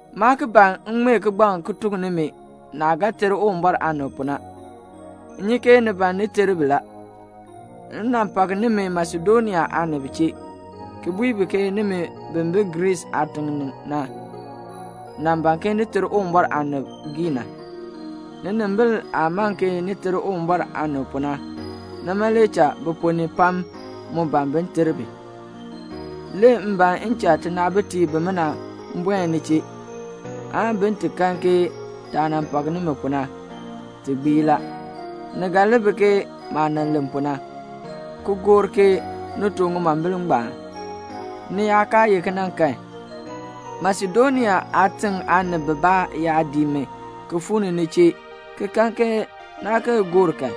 Maa ki ban m ŋmee kigbaŋ ki tuk nimi naah ga ter Uwumbɔr aanib pu na. M nyi ke ni ban ni ter bi la. M nan pak nimi Masedonia aanib chee, ki bui bi ke nimi bi bi Griis aatiŋ ni na nan ban ni ter Uwumbɔr aanib giina. Ninimbil aah man ke ni ter Uwumbɔr aanib pu na, nima le cha bi ponn ni pam mu ban bin ter bi. Le m ban m cha tinaabitiib bimina buen ni chee, aan bin ti kan ke taah nan pak nimi pu na, ti gbii la. Ni ga li bi ke maah nan len pu na, ki gor ke ni too ŋimombil ngbaan. Ni yaa kaa ye kena kan, Masedonia aatiŋ aanib bibaa yaa dii mi ki fuu ni ni chee, ki kan ke naa kee gor kan,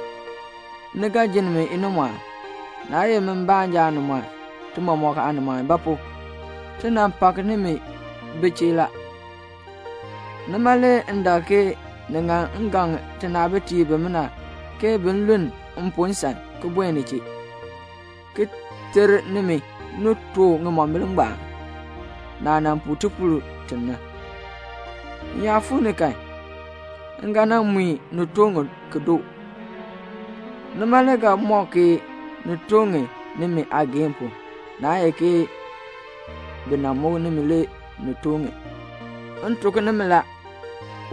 ni ga jinn mi inimɔɔn, naa ye mi baanja aanimɔɔn, ti mɔmɔk aanimɔɔn. Ba pu? ti nan pak nimi bi chee la. Nima le m dak ke ni ŋan m gaŋ tinaabitiib bimina ke bin luln m pu nsan ki buen ni chee, ki ter nimi ni too ŋimombil ngbaan, naah nan puu tipuul ti na. M yaa fuu ni kan, m ga nan mui ni too ŋi ki doo. Nima le ga mɔk ke ni too ŋi nimi aageehn pu, naa ye ke bi nan muk nimi le ni too ŋi. M tuk nimi la,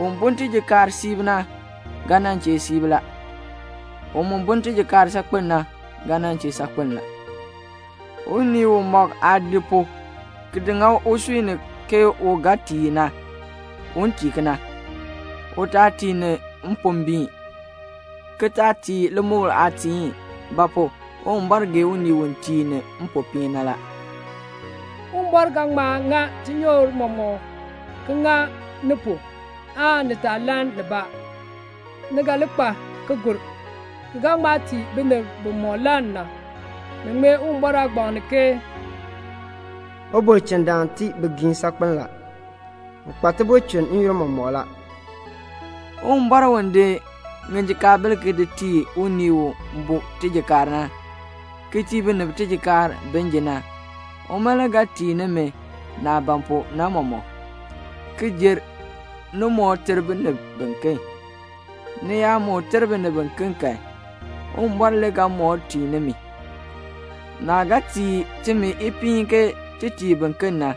un bun tijikaar siib na ga nan chee siib la. U mu bun tijikaar saakpen na ga nan chee saakpen la. Unii umɔk aah di pu ki ŋa usui ni ke u ga tii ni na, un tii kena. U taa tii ni mpombiin, ki taa tii limukl aatiin. Ba pu? Uwumbɔr gee unii u tii ni mpopiin na la. Uwumbɔr ga ŋma ŋa tinyoor mɔmɔk ki ŋa ni pu, aan ni taa lann nibaa. Ni ga li kpa ki gur, ki ga ŋma tii binib bimɔk lann na. Ni ŋmee Uwumbɔr aagbaŋ ni ke "Ubulchindaan tii bigiim saakpen la, u kpa tibulchin n-yoonn mɔmɔk la." Uwumbɔr u di ŋijikaabil di tii unii u bu tijikaar na, ki tii binib tijikaar bin ji na, uma le ga tii nimi naah ban pu na mɔmɔk, ki jer, ni moo ter binib biken. Ni yaa moo ter binib kan, Uwumbɔr le ga moo tii nimi. Naah ga tii timi ipiin ke ti tii biken na,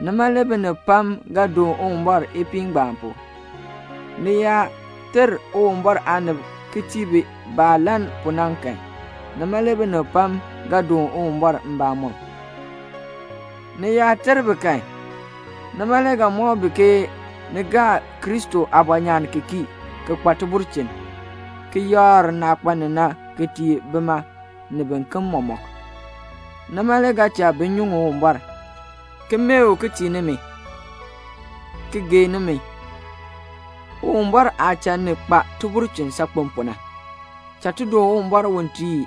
nima le binib pam ga doon Uwumbɔr ipiin ngbaan pu. Ni yaa ter Uwumbɔr aanib ki tii bi baah lann pu na kan, nima le binib pam ga doon Uwumbɔr mbamɔm. Ni yaa ter bi kan, nima le ga mɔk bi ke ni gaa Kristo aabɔnyaan ki kii, ki kpa tibulchin, ki yakr naah kpa ni na ki tii bima, ni biken mɔmɔk. Nima le ga cha bi nyuŋ Uwumbɔr, ki mee u ki tii nimi, ki gee nimi, Uwumbɔr aah cha ni kpa tibulchin saakpen pu na. Cha ti doon Uwumbɔr u tii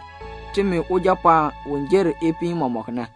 timi Ujapɔɔn u jer ipiin mɔmɔk na.